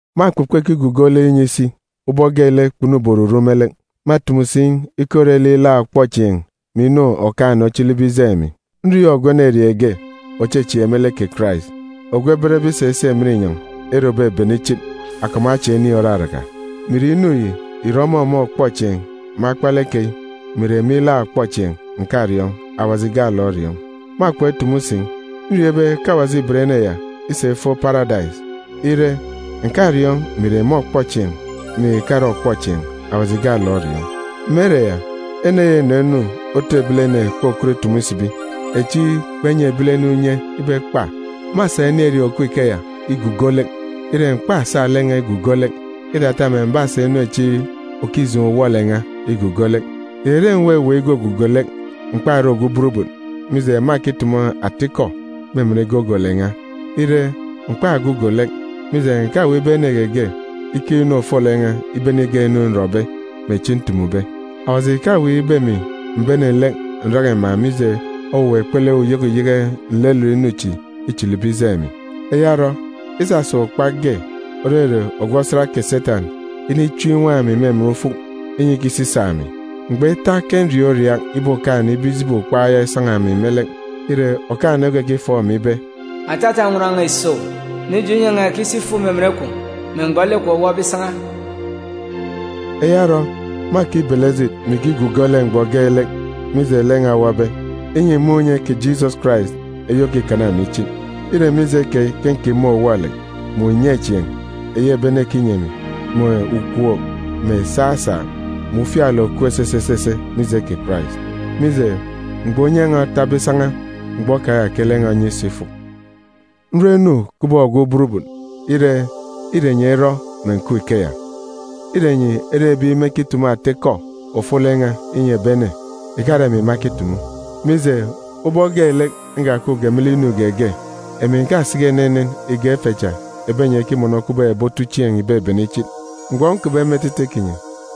Mâkpọkpọ ikigugo lek inyi isi ubọk geelek kpunube oruru me lek. Mâtumu si ikọ ire lek ilaak ọkpọchieen̄ mè inu Okaan̄-ene ochilibe ijeen̄ emi. Nriọọn̄ ogwu enerieen̄ ge òchechieek me lek kè Karais, ogwu ebenbe isa isi emen inyọn̄ ere òbebene ichit, akọp mè acha ini òraraka. Mè ìre inu yi ìrọ ọmọ me ọkpọchieen̄ me akpalek keyi, mè ìre me ilaak ọkpọchieen̄, ǹkariọọn̄, Awaji gaalek oriọọn̄. Mâkpọk itumu si. Nriọọn̄ ibe ke Awaji îben ene ya isa ifo Paradais. Ire, ǹkariọọn̄ mè ìre me ọkpọchieen̄, mè ìkare ọkpọchieen̄, Awaji gaalek oriọọn̄. Me ere ya, ene ya înọ inu otu ebilene kpokọtbe itumu isibi, echi kpenyi ebilene unye ibe ekpa. Mâsa enerieen̄ òkup ikeya igugo lek. Ire, m̀kpasa lek n̄a igugo lek, îtata mè m̀basa inu echi òkijeen̄ uwọ-lek n̄a igugo lek. Ìrere m̀weweek igugugo lek, m̀kpare ogwu burubut, mije, mâkitumu atikọ me emen gogolek n̄a. Ire, m̀kpagugo lek, mije, ǹkaweek ibe ene geege ikeek inu ofolek n̄a ibene igak inu nrọbe, mè echi ntumube. Awaji ìkaweek ibe emi m̀bene lek ǹraka iman̄, mije owuwa ikpele uyeke uyeke nlelet inu chi îchilibe ijeen̄ emi. Eya orọ, isasa ukpak ge, òrere ogwu osat kè Setan, inichim inwaan̄ emi me emen ufuk, inyi ikisisaak emi. Mgbọ ita ke nriaak uriaak ibeek Okaan̄-ene ibe ijibi ukpak ya isan̄a emi me lek. Ire, Okaan̄-ene okekifọọk emi ibe, “Atata nnwọn n̄a îso owu, mije, unye n̄a ìkiso ifuk me emen kwun̄ me mgbọ lek kwun̄ owọbe isan̄a.” Eya orọ, mâkibele ejit mè ikigugo lek mgbọ geelek, mije lek n̄a owọbe, inyi m̀mun̄ unye kè Jisọs Karais eyi òkikana emi ichit. Îre mije keyi ke nkima uwọ-lek, mè unyechieen̄ eyi ebi ene ekinyi emi, mè ukwook, mè saasaak, mè ufialek òkup esese esese mije kè Karais. Mije, mgbọ unye n̄a otabe isan̄a, mgbọ keya ke lek n̄a onye iso ifuk. Nrọ inu kubọk ogwu burubut. Ire, îre enyi erọ mè ǹkup ikeya. Îre enyi ere ebi mekitumu ata ikọ ofolek n̄a inyi ebi ene, ìkare emi makitumu. Mije, ubọk geelek nkakupge me lek inu geege, emi ǹkasiki enenen ìgak ife cha ebi enyi ekimọnọ kubọk ebi otuchieen̄ ìbebene ichit. Mgbọ nkupbe me etete kinyi,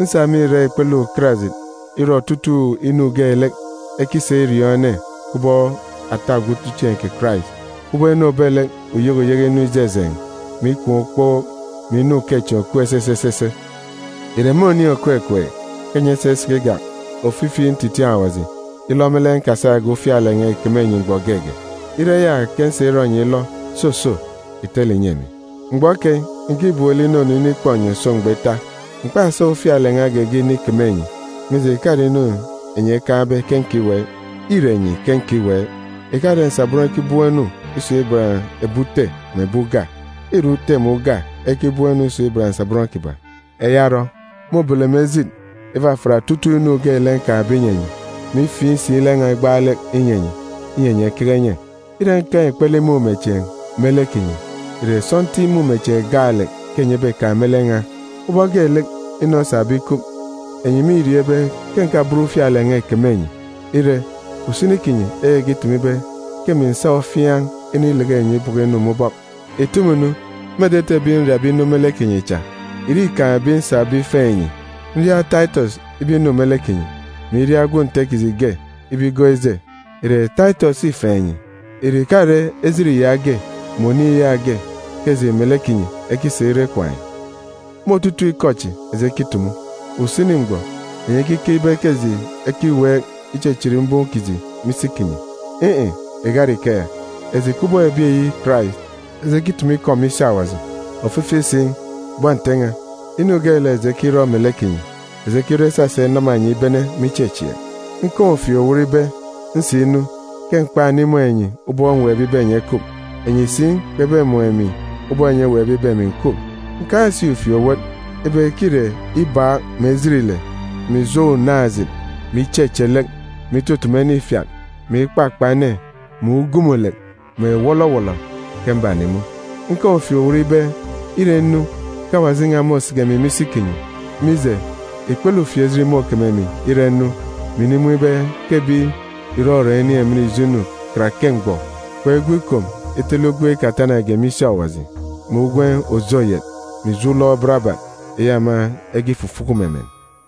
nsa me irak ikpele ukarajit irọ otutuuk inu geelek ekisa iriọọn̄ ene kubọk ata ogwu otuchieen̄ kè Karais, kubọk inu òbet lek uyeke uyeke inu ijejeen̄, mè ikwaan̄ ukpook, mè inu ukechieen̄ òkup esese esese. Ìre me oniin̄ òkukup ke enyi esa isiki igak ofifi ntitiin̄ Awaji, ilọ me lek nkasage ufialek n̄a ìkeme enyi mgbọ geege? Ire eya ke nsa irọ enyi ilọ, soso ìtele ìnyi emi! Mgbọ keyi, ǹkibem lek inunu inikpọ enyi òso mgbọ ita. M̀kpasa ufialek n̄a geege inikeme enyi, mije, ìkare inu enyi ekaan̄be ke nkiweek. Îre enyi ke nkiweek. Ìkare nsabọn ekibọm inu isun̄ iban ebi ute mè ebi uga. Îre ute mè uga ekibọm inu isun̄ iban nsabọn kiban̄. Eya orọ, môbele emi ejit ifafiat otutuuk inu geelek nkaan̄be inyi enyi, mè ifiin̄ si lek n̄a igbaalek inyi enyi, inyi enyi ekeke enye. Ire nkaan̄ ikpele imumechieen̄ me lek kinyi, ìre sọntiik imumechieen̄ gaalek ke enyi ebekaan̄ me lek n̄a? Ubọk geelek inu osabe ikup, enyi mîriọọn̄ ibe ke ǹkaben ufialek n̄a ìkeme enyi. Ire, usini kinyi ekekitumu ibe ke emi ǹsa ofiaan̄ inileke enyi ibọkọ inu me ubọk. Ìtumu nu, me etete ebi nriabe inu me lek kinyi cha, ìre îkaan̄ ebi nsabe ifeen̄ enyi? Nria Taitọs ibe inu me lek kinyi, mè iria gwun̄ Nte kiji ge ibe igọọk ije. Ìre Taitọs îfeen̄ enyi? Ìre ìkare ejit yaage mè oniin̄ yaage ke eji melek kinyi ekisa irọ ikwaan̄ yi? Me otutuuk ikọ chi eji ekitumu, usini mgbọ enyi ekikeek ibe ke eji ekiweek ichichit mbum kiji me isi kinyi. In̄-in̄, ìkare ikeya! Eji kubọk ebi eyi Karais, eji ekitumu ikọ me isi Awaji. Ofifi si, bọn Nte n̄a, inu geelek eji ekirọ melek kinyi, eji ekirọ isasa inama enyi ibene me ichechieek. Nkaan̄ ufieek-owot ibe, nsinu, ke m̀kpanimun̄ enyi ubọk mweekbe ibe enyi ekup, enyi si kpebemun̄ emi ubọk enyi eweekbe ibe emi ǹkup. Nkaan̄ si ufieek-owot ibe ke îre ibaak, mè ejit ile, mè ijo unaan̄-ejit, mè icheche lek, mè itutumu ene ifiat, mè ikpakpa ene, mè ugumulek, mè wọlọwọlọ ke mbanimun̄. Nkaan̄ ufieek-owot ibe, ire nnu, ke Awaji n̄a môsiki emi me isi kinyi. Mije, ikpele ufieejit môkeme emi, ire nnu, mè inimun̄ ibe ke ebi ìrọrọn̄ inin̄ emen ijo inu karake mgbọ, kpegwu ikom itele ugwem ikatanage me isi Awaji, mè ugwem òje oyet, mè ijo ulọk barabat eyi ema ekifufuku me emen.